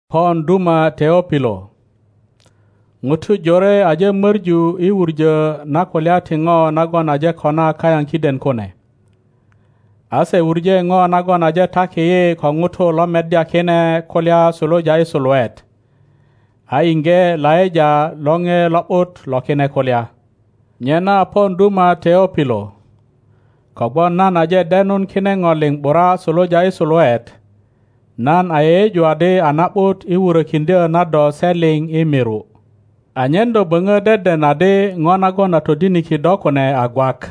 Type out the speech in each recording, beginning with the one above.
Pon duma Teopilo; ŋutu jore aje moru i wuŋo na kulya ti ŋo nagon aje kona kayaŋ kiden kune. a se wuŋe ŋo nagon aje taki yi ko ŋutu lo meddya kine kulya suluja i suluet, a iŋge laŋa lore lo ’but lo kine kulya. Nyena pon duma Teopilo, kogwon nan aje denun kine ŋo liŋ ’bura suluja i suluet, nan a yeyeju adi a na ’but i wurokiŋdyo na do se liŋ i miru, anyen do boŋo deden adi ŋo nagon a todiniki do kune a gwak.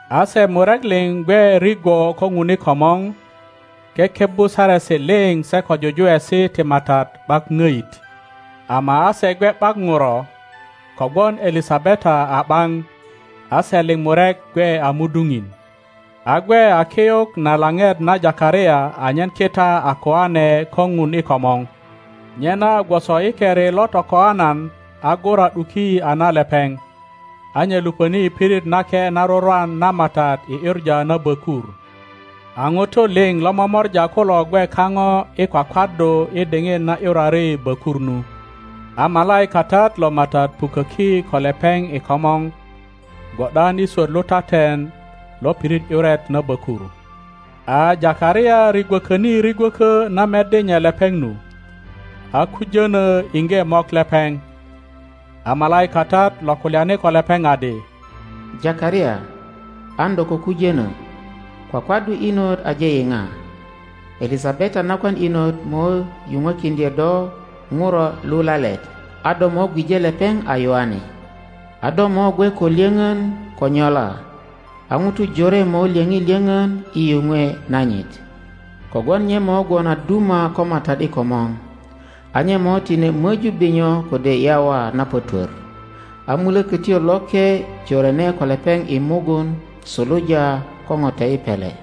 A se murek liŋ gwe rigwo ko Ŋun i komor kekebbu saresi liŋ se ko jujuwesi ti MATAT ’bak ŋoit. Ama a se gwe ’bak ŋuro, kogwon Elisabeta a ’baŋ, a se liŋ murek gwe a muduŋin. A gwe a kiyuk na laŋet na Takaria anyen kita a koane ko ŋun i komor, nyena gwoso i keri lo tokoaŋan a gura ’duki a na lepeŋ, a nye luponi i pirit nake na rurwan na MATAT i ’yuŋa na bökur. A ŋutu liŋ lo momora kulo gwe kaŋo i kwakwaddu i diŋit na ’yurari bökur nu. A malaikatat lo MATAT puköki ko lepeŋ i komor gwo ’dan i swot lutaten lo pirit ’yuret na bökur. A Takaria rigwokoni rigwökö na meddi nye lepeŋ nu, a kujono iŋge mok lepeŋ. A malaikatat lo kulyani ko lepeŋ adi, Takaria, an do ko kujönö; kwakwaddu inot aje yiŋa: Elisabeta nakwan inot mo yuŋwekiŋdyo do ŋuro lulalet, a do mo gwije lepeŋ a Yoane. A do mo gwe ko lyoŋon ko nyola, a ŋutu jore mo lyoŋi lyoŋon i yuŋwe nanyit. Kogwon nye mo gwon a duma ko MATAT i komor, a nye mo tine möju binyo kode yawa na pötwör, a Mulökötyo Loke jorene ko lepeŋ i mugun suluja ko ŋote i pele,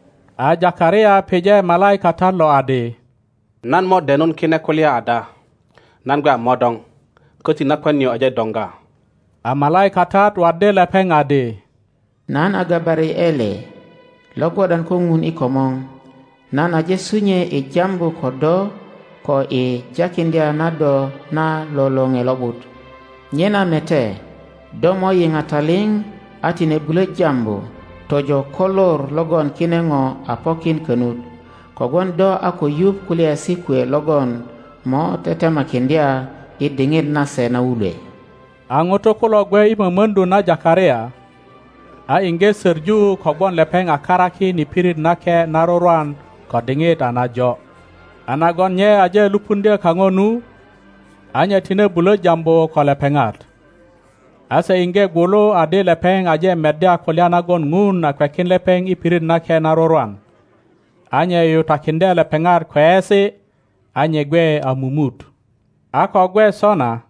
A Takaria pije malaikatat lo adi, Nan mo denun kine kulya ada? Nan gwe a modoŋ, koti nakwan nio aje doŋga. A malaikatat waddi lepeŋ adi, Nan a Gabariele, lo gwo ’dan ko Ŋun i komor; nan aje sunyue i jambu ko do ko i jakiŋdya na do na lo lore lo ’but. Nyena mete, do mo yiŋa taliŋ a tine bulo jambu tojo ko lor logon kine ŋo a pokin konut, kogwon do a ko yuŋ kulyaesi kwe logon mo tetemakiŋdya i diŋit nase na wulwe. A ŋutu kulo gwe i momoŋdu na Takaria, a iŋge soŋu kogwon lepeŋ a karakin i pirit nake na rurwan ko diŋit a najo. A nagon nye aje lupuŋdyo kaŋo nu, a nye tine bulo jambu ko lepeŋat, a se iŋge gwulu adi lepeŋ aje meddya kulya nagon Ŋun a kwekin lepeŋ i pirit nake na rurwan; a nye yuyutakiŋdye lepeŋat kweyesi, a nye gwe a mumut. a ko gwe sona,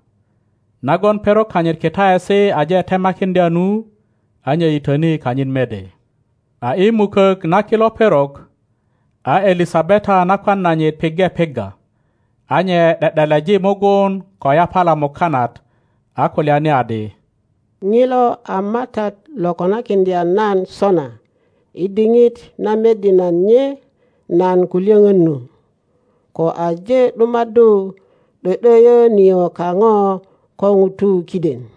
nagon perok kanyit kitaesi aje temakiŋdya nu, a nye yitöni kanyit mede. A i mukok na kilo perok, a Elisabeta nakwan nanyit piŋge pigga, a nye ’de ’deleji mugun ko yapala mukanat, a kulyani adi, Ŋilo a MATAT lo konakiŋdya nan sona i diŋit na meddi nye nan ko lyoŋon nu, ko aje ’dumaddu ’do ’doyo nio kaŋo ko ŋutu kiden.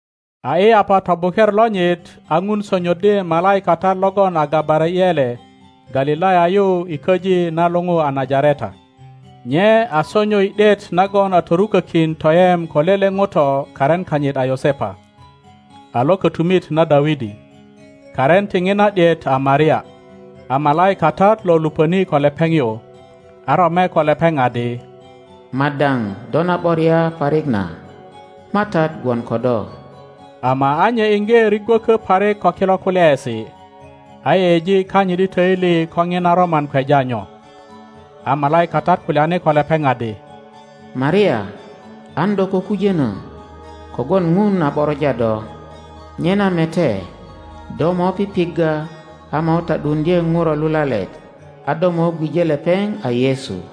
A i yapa tobuker lonyit, a Ŋun sonyoddi malaikatat logon a Gabariele Galilaya yu i köji na luou a Najareta. Nye a sonyo i ’diet nagon a torukökin toyem ko lele ŋuto karin kanyit a Yosepa, a lo kotumit na Dawidi. Karin ti ŋina ’diet a Maria. a malaikatat lo lupöni ko lepeŋ yu, a rome ko lepeŋ adi, Madao, do na ’boria parik na, MATAT gwon ko do. Ama a nye iŋge rigwökö parik ko kilo kulyaesi, a yeyeji kanyit i toili ko ŋina roman kweja nyo. A malaikatat kulyani ko lepeŋ adi, Maria, an do ko kujono, kogwon Ŋun a ’boroja do. Nyena, mete, do mo pipigga a mo ta ’duuŋdye ŋuro lulalet, a do mo gwije lepeŋ a Yesu.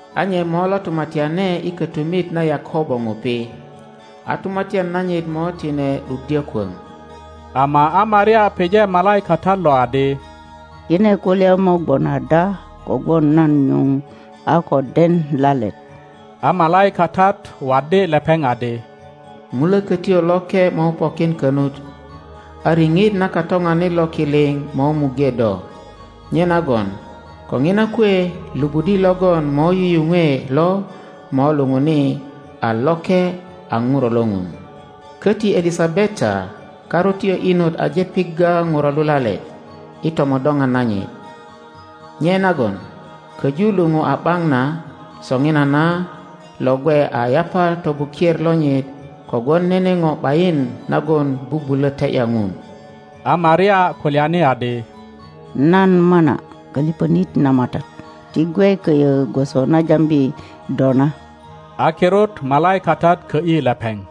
a nye mo lo tumatyane i kotumit na Yakobo ŋupi, a tumatyan nanyit mo tine ’duddyo kwöŋ. Ama a Maria pije malaikatat lo adi, Kine kulya mo gwon ada kogwon nan nyuŋ a ko den lalet? A malaikatat waddi lepeŋ adi, Mulökötyo Loke mo pokin konut, a riŋit na Katoŋanit lo ki liŋ mo muŋge do, nyenagon ko ŋina kwe lupudi logon mo yuyuŋwe lo mo luŋuni a loke, a Ŋuro lo ŋun. Koti Elisabeta karutyo inot aje pigga ŋuro lulalet i tomodoŋan nanyit; nye nagon koju luŋu a ’baŋ na soŋinana lo gwe a yapa tobuker lonyit. Kogwon nene ŋo ’bayin nagon bubulo te ’ya Ŋun. A Maria kulyani adi, Nan mana koliponit na MATAT, ti gwe koyo gwoso na jambi do na. A kirut malaikatat kö ’yi lepeŋ.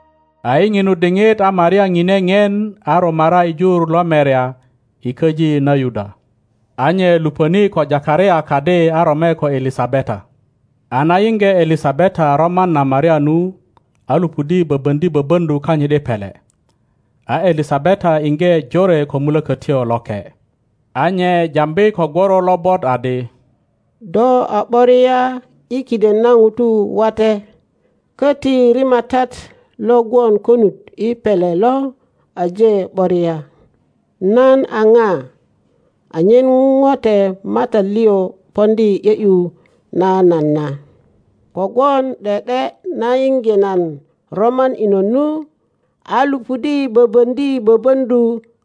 A i ŋinu diŋit a Maria ŋine ŋien a rumara i jur lo merya i köji na Yuda. A nye lupöni ko Takaria kadi a rome ko Elisabeta. A na yiŋge Elisabeta roman na Maria nu, a lupudi boboŋdi boboŋdu kanyit i pele. A Elisabeta iŋge jore ko Mulokotyo Loke. a nye jambi ko gworo lobot adi, Do a ’boria i kiden na ŋutu wate, koti rimatat lo gwon konut i pele lo aje ’boria. Nan a ŋa anyen ŋote MATAT liŋ poŋdi i ’yo ’yu na nan na? Kogwon ’de ’de na yiŋge nan roman inot nu, a lupudi boboŋdi boboŋdu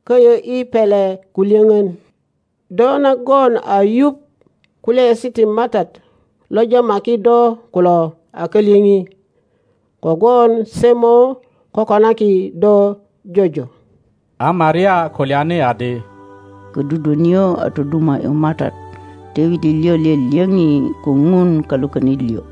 koyo i pele ko lyoŋon. Do nagon a yuŋ kulyaesi ti MATAT lo jamaki do kulo a kalyoŋi, kogwon se mo kokonaki do jojo. A Maria kulyani adi, Kodudwo nio toduma ’yu MATAT, toili liŋ lyolyoŋi ko Ŋun Kalwokonit liŋ,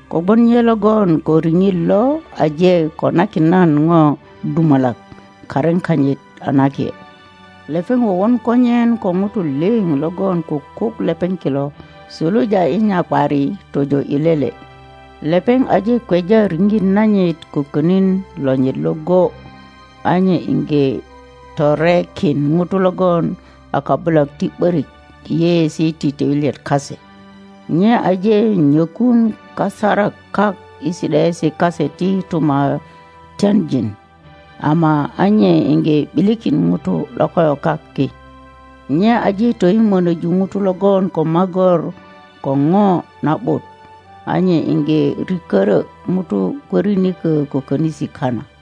Kogwon nye logon ko riŋit lo aje konakin nan ŋo dumalak. Karin kanyit a nake. Lepeŋ wowon konyen ko ŋutu liŋ logon kukuk lepeŋ kilo suluja i nyakwari tojo i lele. Lepeŋ aje kweja riŋit nanyit ko konin lonyit iŋgo, a nye iŋge torekin ŋutu logon a kabulak ti ’borik i yeyeesi ti toilyet kase. Nye aje nyokun kasarak kak i si ’daesi kase ti tumatyanjin, ama a nye iŋge ’bilikin ŋutu lokoyokak ki. Nye aje toyimonoju ŋutu logon ko magor ko ŋo na ’but, a nye iŋge rikörö ŋutu kwörinikö ko konisi kana.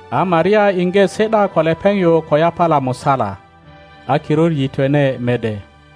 A Maria iŋge si ’da ko lepeŋ yu ko yapala musala, a kirut yitwene mede.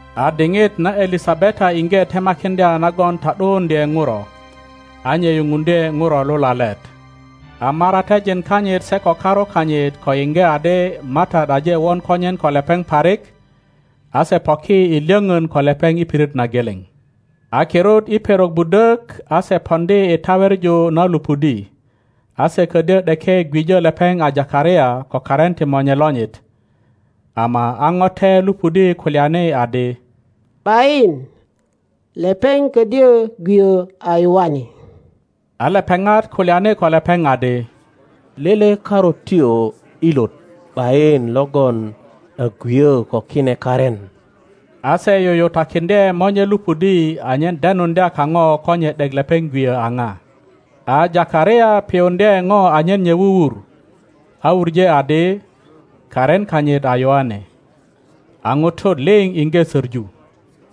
A diŋit na Elisabeta iŋge temakiŋdya nagon ta ’duuŋdye ŋuro; a nye yuŋuŋdye ŋuro lulalet. a maratejin kanyit se ko karu kanyit ko yiŋge adi MATAT aje won konyen ko lepeŋ parik, a se poki i lyoŋon ko lepeŋ i pirit na geleŋ. A kirut i perok budok a se poŋdi i taweŋu na lupudi, a se kodyo ’deke gwijo lepeŋ a Takaria ko karin ti monye lonyit. Ama a ŋote lupudi kulyani adi, ’Bayin, lepeŋ kodyo gwiyo a Yoane, a lepeŋat kulyani ko lepeŋ adi, Lele karutyo ilot ’bayin logon a gwiyo ko kine karin. a se yuyutakiŋdye monye lupudi anyen denuŋdya kaŋo ko nye ’dek lepeŋ gwiyo a na. A Takaria piyuŋdye ŋo anyen nye wuwur, a wuŋe adi, Karin kanyit a Yoane. A ŋutu liŋ iŋge soŋu.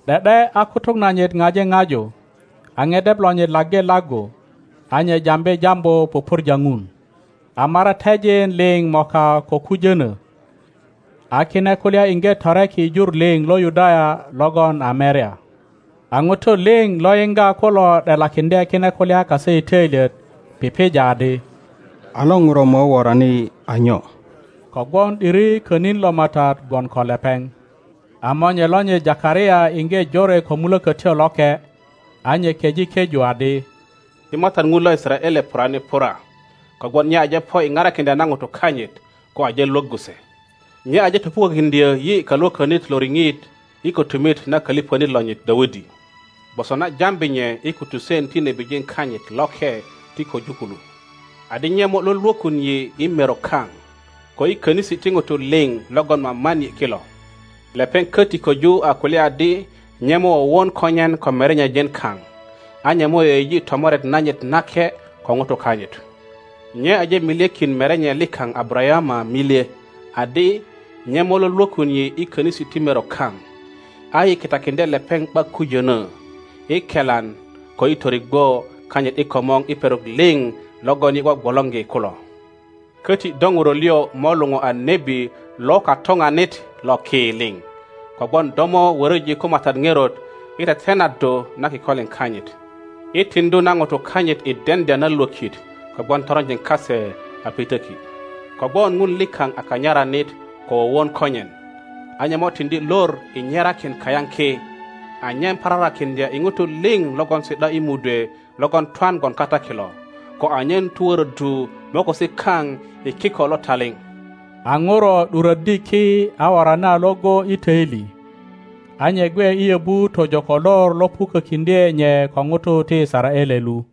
’De ’de a kutuk nanyit ŋaji ŋaju, a ŋedep lonyit laggi laggu, a nye jambi jambu pupurja ŋun. A maratejin liŋ moka ko kujono, a kine kulya iŋge toreki i jur liŋ lo Yudaya logon a merya. A ŋutu liŋ lo yiŋga kulo ’delakiŋdye kine kulya kase i töilyet, pipija adi, A lo ŋuro mo worani a nyo? Kogwon ’diri konin lo MATAT gwon ko lepeŋ. A monye lonyit Takaria iŋge jore ko Mulökötyo Loke, a nye keŋ keju adi, Ti MATAT Ŋun lo Yisaraele purani pura, kogwon nye aje po i parakiŋdya na ŋutu kanyit, ko aje Iwoggu se. Nye aje topukokiŋdyo yi Kalwo konit lo riŋit i kotumit na koliponit lonyit Dawidi, gwoso na jambi nye i kutusen ti nebijin kanyit loke ti koju kulu, adi nye mo Iwolwokun yi i merok kaŋ, ko i konisi ti ŋutu liŋ logon maman yi kilo. Lepeŋ koti koju a kulya adi nye mo wowon konyen ko merenye-jin kaŋ, a nye mo yeyeji tomoret nanyit nake ko ŋutu kanyit. Nye aje milyekin merenye likaŋ Abarayama milye, adi, nye mo Iwolwokun yi i konisi ti merok kaŋ, a yi kitakiŋdye lepeŋ ’bak kujono, i kelan ko i torigwo kanyit i komor i perok liŋ logon yi gwogwolorgi kulo. Koti do ŋuro liŋ mo luou a nebi lo Katoŋanit lo ki liŋ, kogwon do mo woroji ko MATAT ŋerot i tetenaddu na kikolin kanyit, i tiŋdu na ŋutu kanyit i deŋdya na lwökt kogwon toronjin kase a pitöki. Kogwon Ŋun likaŋ a kanyaranit ko wowon konyen, a nye mo tiŋdi lor i nyerakin kayaŋ ki, anyen pararakiŋdya i ŋutu liŋ logon si ’da i mudwe logon twan gwon kata kilo, ko anyen tuworoddu mokosi kaŋ i kiko lo taliŋ. A ŋuro ’duroddi ki a worani a iŋgo i toili. A nye gwe i yobu tojo ko lor lo pukokiŋdye nye ko ŋutu ti Yisaraele lu.